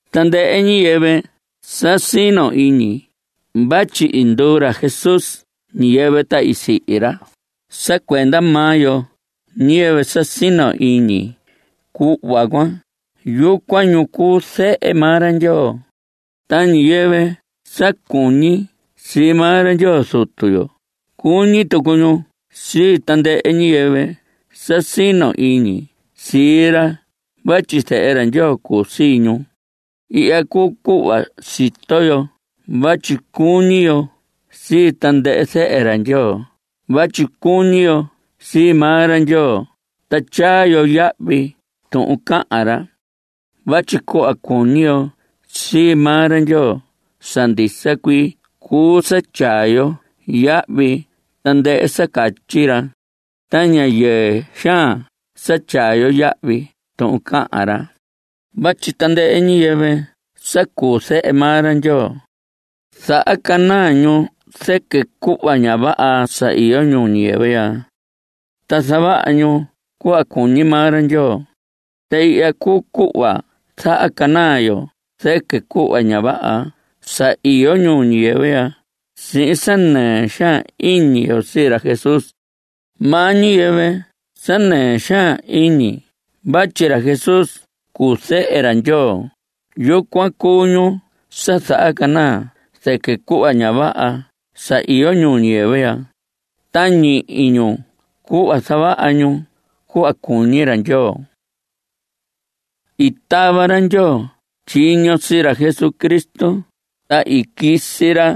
Tandɨhɨ ñiyɨvɨ sa sino iñi vatyi i nduu ra Jesús ñiyɨvɨ ta i sihi ra sa cuenda maa yo, ñiyɨvɨ sa sino iñi cuhva cuan, yucuan ñu cuu zehe maa ra Ndyoo. Ta ñiyɨvɨ sa cuñi sii maa ra Ndyoo Zutu yo, cuñi tucu ñu sii tandɨhɨ ñiyɨvɨ sa sino iñi sii ra vatyi zehe ra Ndyoo cuu sii ñu. Ihya cuu cuhva sito yo vatyi cuñi yo sii tandɨhɨ zehe ra Ndyoo vatyi cuñi yo sii maa ra Ndyoo ta tyaa yo yahvi tuhun cahan ra. Vatyi cuhva cuñi yo sii maa ra Ndyoo sa ndisa cuii cuu sa tyaa yo yahvi tandɨhɨ sa catyi ra. Ta ña yɨɨ xaan sa tyaa yo yahvi tuhun cahan ra. Vatyi tandɨhɨ ñiyɨvɨ sa cuu zehe maa ra Ndyoo, zahacanaa ñu zɨquɨ cuhva ña vaha sa iyo ñuu ñiyɨvɨ ya, ta zavaha ñu cuhva cuñi maa ra Ndyoo. Ta ihya cuu cuhva zahacanaa yo zɨquɨ cuhva ña vaha sa iyo ñuu ñiyɨvɨ ya, sihin sa nɨɨ xaan iñi yo sii ra Jesús. Maa ñi ñiyɨvɨ sa nɨɨ xaan iñi vatyi ra Jesús cuu zehe ra Ndyoo, yucuan cuu ñu sa zahacanaa zɨquɨ cuhva ña vaha sa iyo ñuu ñiyɨvɨ ya, ta ñihi ñu cuhva zavaha ñu cuhva cuñi ra Ndyoo. I tava ra Ndyoo tyiño sii ra Jesucristo, ta i quisi ra,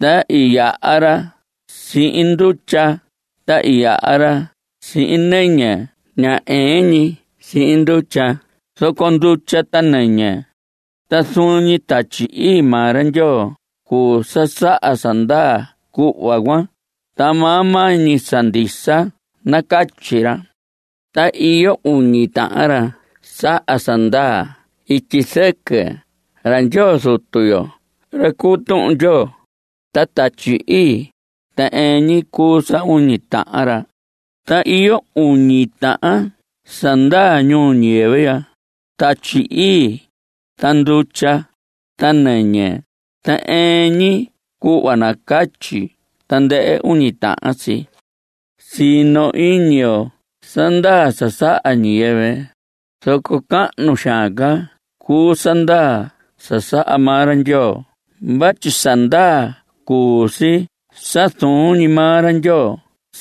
ta i yaha ra sihin ndutya, ta i yaha ra sihin nɨñɨ; ña ɨɨn ñi sihin ndutya zoco ndutya ta nɨñɨ. Ta zuun ñi Tatyi Ii maa ra Ndyoo cuu sa saha sa ndaa cuhva cuan, ta maa maa ñi sa ndisa nacatyi ra. Ta iyo uñi tahan ra saha sa ndaa ityi zɨquɨ: ra Ndyoo Zutu yo, ra cuu Tuhun Ndyoo, ta Tatyi Ii. Ta ɨɨn ñi cuu sa uñi tahan ra. Ta iyo uñi tahan sa ndaa ñuu ñiyɨvɨ: Tatyi Ii, ta ndutya, ta nɨñɨ. Ta ɨɨn ñi cuhva nacatyi tandɨhɨ uñi tahan si. Sino iñi yo sa ndaa sa saha ñiyɨvɨ, zoco cahnu xaan ca cuu sa ndaa sa saha maa ra Ndyoo vatyi sa ndaa cuu si sa zuun ñi maa ra Ndyoo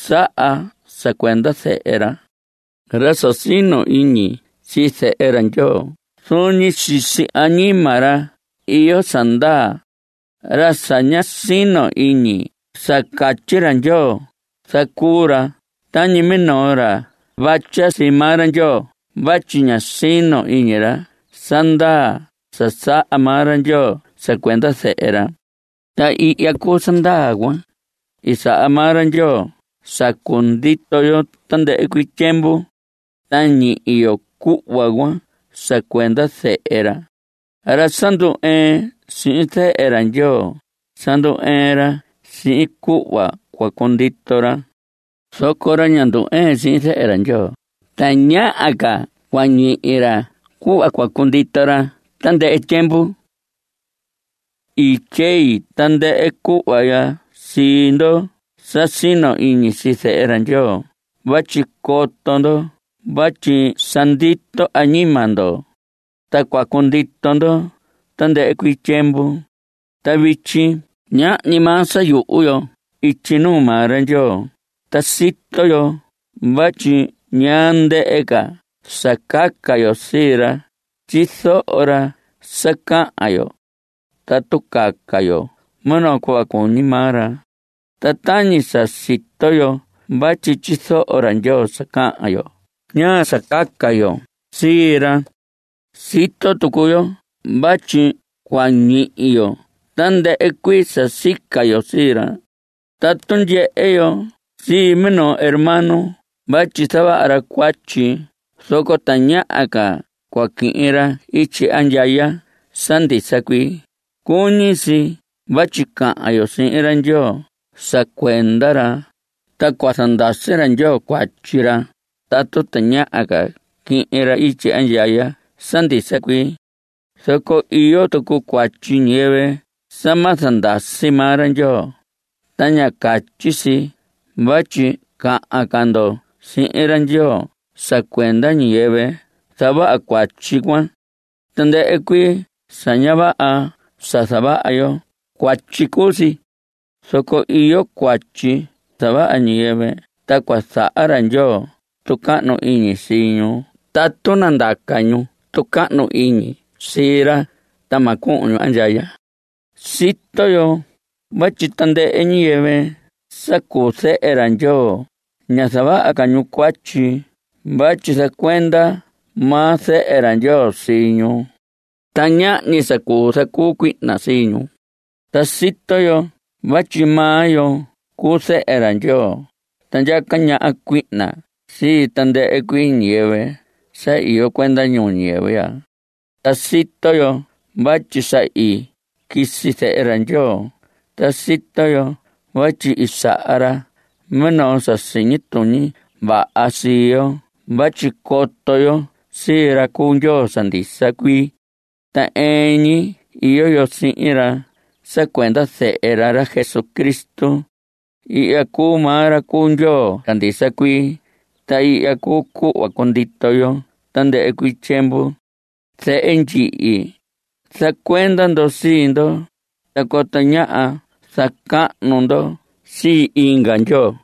saha sa cuenda Zehe ra. Ra sa sino iñi sii Zehe ra Ndyoo, zuun ñi sisi añima ra iyo sa ndaa. Ra sa ña sino iñi sa catyi ra Ndyoo, zacuu ra tañi minoo ra vatya sii maa ra Ndyoo vatyi ña sino iñi ra sa ndaa sa saha maa ra Ndyoo sa cuenda Zehe ra. Ta ihya cuu sa ndaa cuan. I saha maa ra Ndyoo sa cundito yo tandɨhɨ cuii tyiemvu. Ta ñihi yo cuhva cuan sa cuenda Zehe ra. Ra sa ndu‑ɨɨn sihin Zehe ra Ndyoo, sa ndu‑ɨɨn ra sihin cuhva cua cundito ra. Zoco ra ña ndu‑ɨɨn sihin Zehe ra Ndyoo tañaha ca cua ñihi ra cuhva cua cundito ra tandɨhɨ tyiemvu. I tyei tandɨhɨ cuhva ya sii ndoho sa sino iñi sii Zehe ra Ndyoo vatyi coto ndo vatyi sa ndito añima ndo. Ta cua cundito ndo tandɨhɨ cuii tyiemvu. Ta vityi ñahñi maa sa yuhu yo ityi nuu maa ra Ndyoo, ta sito yo vatyi ñaa ndɨhɨ ca sa caca yo sii ra, tyizoho ra sa cahan yo tatu caca yo minoo cuhva cuñi maa ra. Ta tañi sa sito yo vatyi tyizoho ra Ndyoo sa cahan yo, ñaa sa caca yo sii ra. Sito tucu yo vatyi cua ñihi yo tandɨhɨ cuii sa sica yo sii ra. Tatu ndyehe yo sii minoo hermano vatyi zavaha ra cuatyi zoco tañaha ca cua quihin ra ityi andyaya sa ndisa cuii, cuñi si vatyi cahan yo sihin ra Ndyoo sa cuenda ra, ta cua zandasi ra Ndyoo cuatyi ra, tatu tañaha ca quihin ra ityi andyaya sa ndisa cuii. Zoco iyo tucu cuatyi ñiyɨvɨ sa ma zandasi maa ra Ndyoo, ta ña catyi vatyi cahan ca ndo sihin ra Ndyoo sa cuenda ñiyɨvɨ zavaha cuatyi cuan. Tandɨhɨ cuii sa ña vaha sa zavaha yo, cuatyi cuu si. Zoco iyo cuatyi zavaha ñiyɨvɨ ta cua zaha ra Ndyoo tucahnu iñi sii ñu tatu nandaca ñu tucahnu iñi sii ra, ta ma cuhun ñu andyaya. Sito yo vatyi tandɨhɨ ñiyɨvɨ sa cuu zehe ra Ndyoo, ña zavaha ca ñu cuatyi vatyi zacuenda maa Zehe ra Ndyoo sii ñu. Ta ñahñi sa cuu zacuu cuihna sihin ñu. Ta sito yo vatyi maa yo cuu zehe ra Ndyoo, ta ndyaca ñaha cuihna sii tandɨhɨ cuii ñiyɨvɨ sa iyo cuenda ñuu ñiyɨvɨ ya. Ta sito yo vatyi sa i quisi Zehe ra Ndyoo. Ta sito yo vatyi i saha ra minoo sa siñi tuñi vaha sii yo vatyi coto yo sii ra cuu Ndyoo sa ndisa cuii. Ta ɨɨn ñi iyo yo sihin ra sa cuenda Zehe ra, ra Jesucristo. Ihya cuu maa ra cuu Ndyoo sa ndisa cuii, ta ihya cuu cuhva cundito yo tandɨhɨ cuii tyiemvu. Zehe ndyihi, zacuenda ndo sii ndo, ta coto ñáha zacahnu ndo sii inga ndyoo.